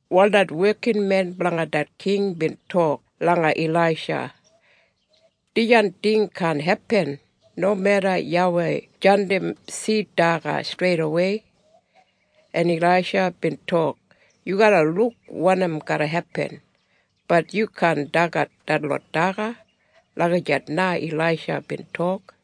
Wal det wekinmen blanga det king bin tok langa Ilaisha, “Dijan ting kaan hepin, nomeda YAWEI jandim sid daga streidawei.” En Ilaisha bin tok, “Yu garra luk wanim garra hepin, bat yu kaan dagat detlot daga.” Lagijat na Ilaisha bin tok.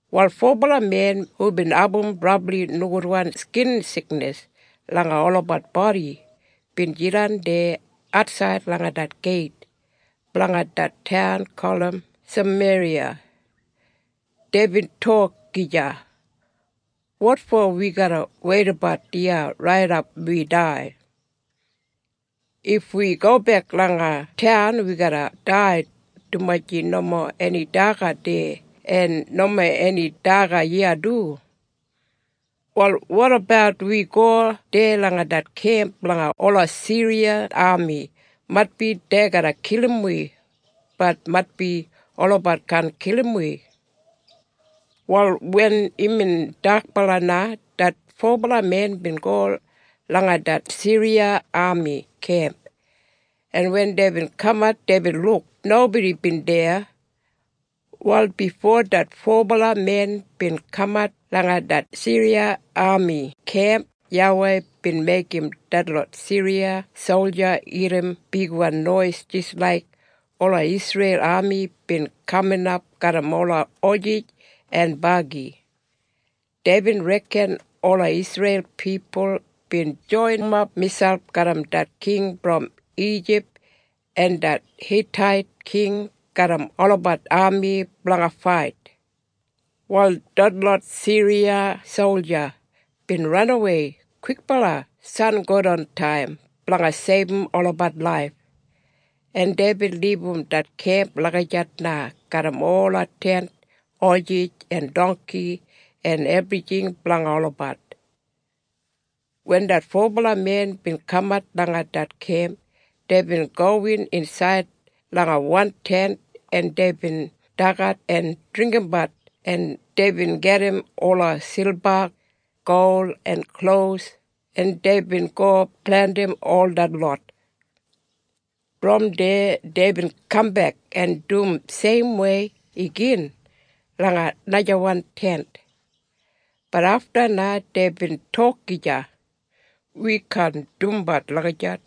Wal fobala men hubin abum brabli nogudwan skin siknis langa olabat bodi bin jidan deya atsaid langa det geit blanga det taun gulum Sameriya. Deibin tok gija, “Wotfo wi garra weidabat iya raidap wi dai? If wi gobek langa taun wi garra dai, dumaji nomo eni daga deya en nomo eni daga iya du. Wal wotabat wi go deya langa det kemp blanga ola Siriya ami? Maitbi dei garra kilim wi, bat maitbi olabat kaan kilim wi.” Wal wen imbin dakbala na det fobala men bin go langa det Siriya ami kemp en wen deibin kamat deibin luk nobodi bin deya. Wal bifo det fobala men bin kamat langa det Siriya ami kemp YAWEI bin meigim detlot Siriya solja irrim bigwan nois jis laik ola Isreil ami bin kaminap garram ola hosis en bagi. Deibin reken ola Isreil pipul bin joinimap miselp garram det king brom Ijip en det Hitait king garram olabat ami blanga fait. Wal detlot Siriya solja bin ranawei kwikbala sangodantaim blanga seibum olabat laif, en deibin libum det kemp lagijat na garram ola tent, hosis en dongki en ebrijing blanga olabat. Wen det fobala men bin kamat langa det kemp deibin gowin insaid langa wan tent en deibin dagat en dringgimbat en deibin gajim ola silba, gol en klos en deibin go blandim ol detlot. Brom deya deibin kambek en dum seimwei igin langa najawan tent. Bat afta na deibin tok gija, “Wi kaan dumbat lagijat.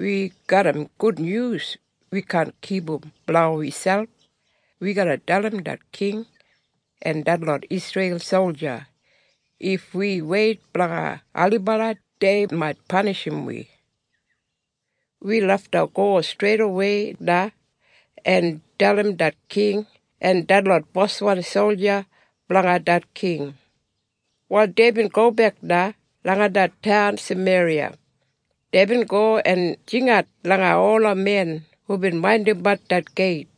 Wi garram gudnyus wi kaan kipum blanga wi selp, wi garra dalim det king en detlot Isreil solja, if wi weit blanga ailibala dei mait panishim wi. Wi lafta go streidawei na en dalim det king en detlot boswan solja blanga det king.” Wal deibin gobek na langa det taun Sameriya. Deibin go en jingat langa ola men hubin maindimbat det geit,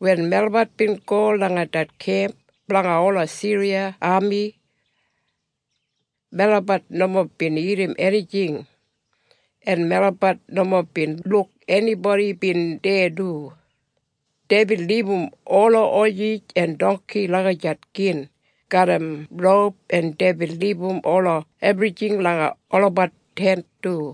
“Wen melabat bin go langa det kemp blanga ola Siriya ami. Melabat nomo bin irrim enijing en melabat nomo bin luk enibodi bin deya du. Deibin libum ola hosis en dongki lagijat gin garram roup en deibin libum ola ebrijing langa olabat tent du.”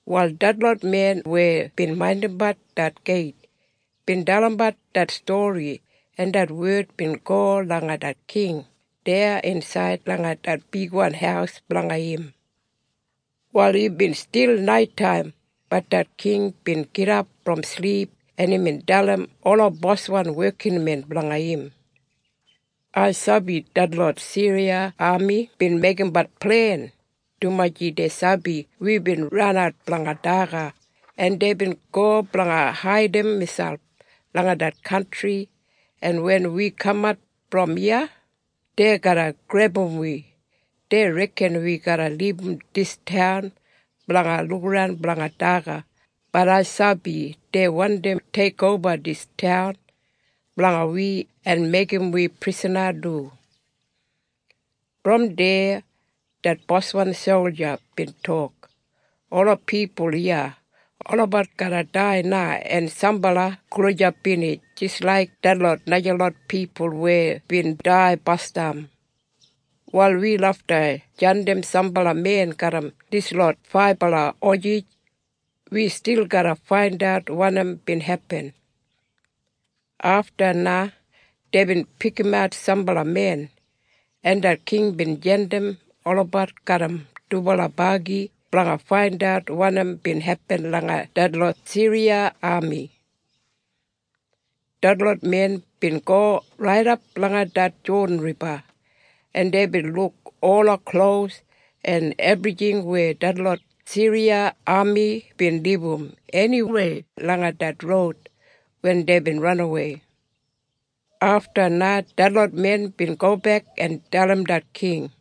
Wal detlot men weya bin maindimbat det geit bin dalimbat det stori en det wed bin go langa det king deya insaid langa det bigwan haus blanga im. Wal imbin stil naitaim bat det king bin gidap brom silip en imbin dalim ola boswan wekinmen blanga im, “Ai sabi detlot Siriya ami bin meigimbat plen, dumaji dei sabi wibin ranat blanga daga en deibin go blanga haidim miselp langa det kantri en wen wi kamat brom iya, dei garra grebum wi. Dei reken wi garra libum dis taun blanga lukaran blanga daga bat ai sabi dei wandi teikoba dis taun blanga wi en meigim wi prisana du.” Brom deya det boswan solja bin tok, “Ola pipul iya, olabat garra dai na en sambala gulijap binij jis laik detlot najalot pipul weya bin dai basdam. Wal wi lafta jandim sambala men garram dislot faibala hosis, wi stil garra faindat wanim bin hepin.” Afta na deibin pikimat sambala men en det king bin jandim olabat garram dubala bagi blanga faindat wanim bin hepin langa detlot Siriya ami. Detlot men bin go raidap langa det Jodan Riba en deibin luk ola klos en ebrijing weya detlot Siriya ami bin libum eniwei langa det roud wen deibin ranawei. Afta na detlot men bin gobek en dalim det king.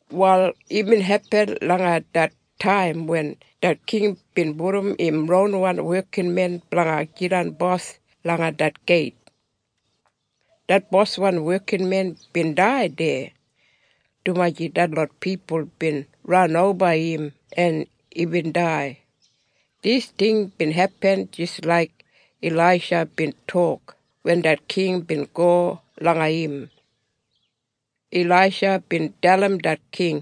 Wal imbin hepin langa det taim wen det king bin pudum im ronwan wekinmen blanga jidan bos langa det geit. Det boswan wekinmen bin dai deya, dumaji detlot pipul bin ranoba im en imbin dai. Dis ting bin hepin jis laik Ilaisha bin tok wen det king bin go langa im. Ilaisha bin dalim det king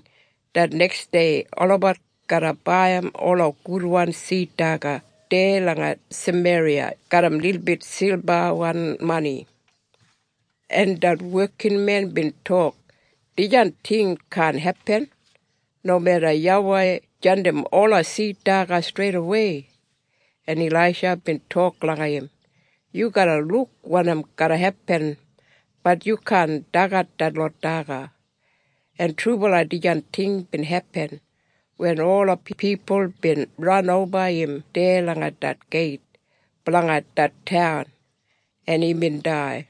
det neksdei olabat garra baiyim ola gudwan sid daga deya langa Sameriya garram lilbit silbawan mani. En det wekinmen bin tok, “Dijan ting kaan hepin, nomeda YAWEI jandim ola sid daga streidawei.” En Ilaisha bin tok langa im, “Yu garra luk wanim garra hepin bat yu kaan dagat detlot daga.” En trubala dijan ting bin hepin wen ola pipul bin ranoba im deya langa det geit blanga det taun, en imbin dai.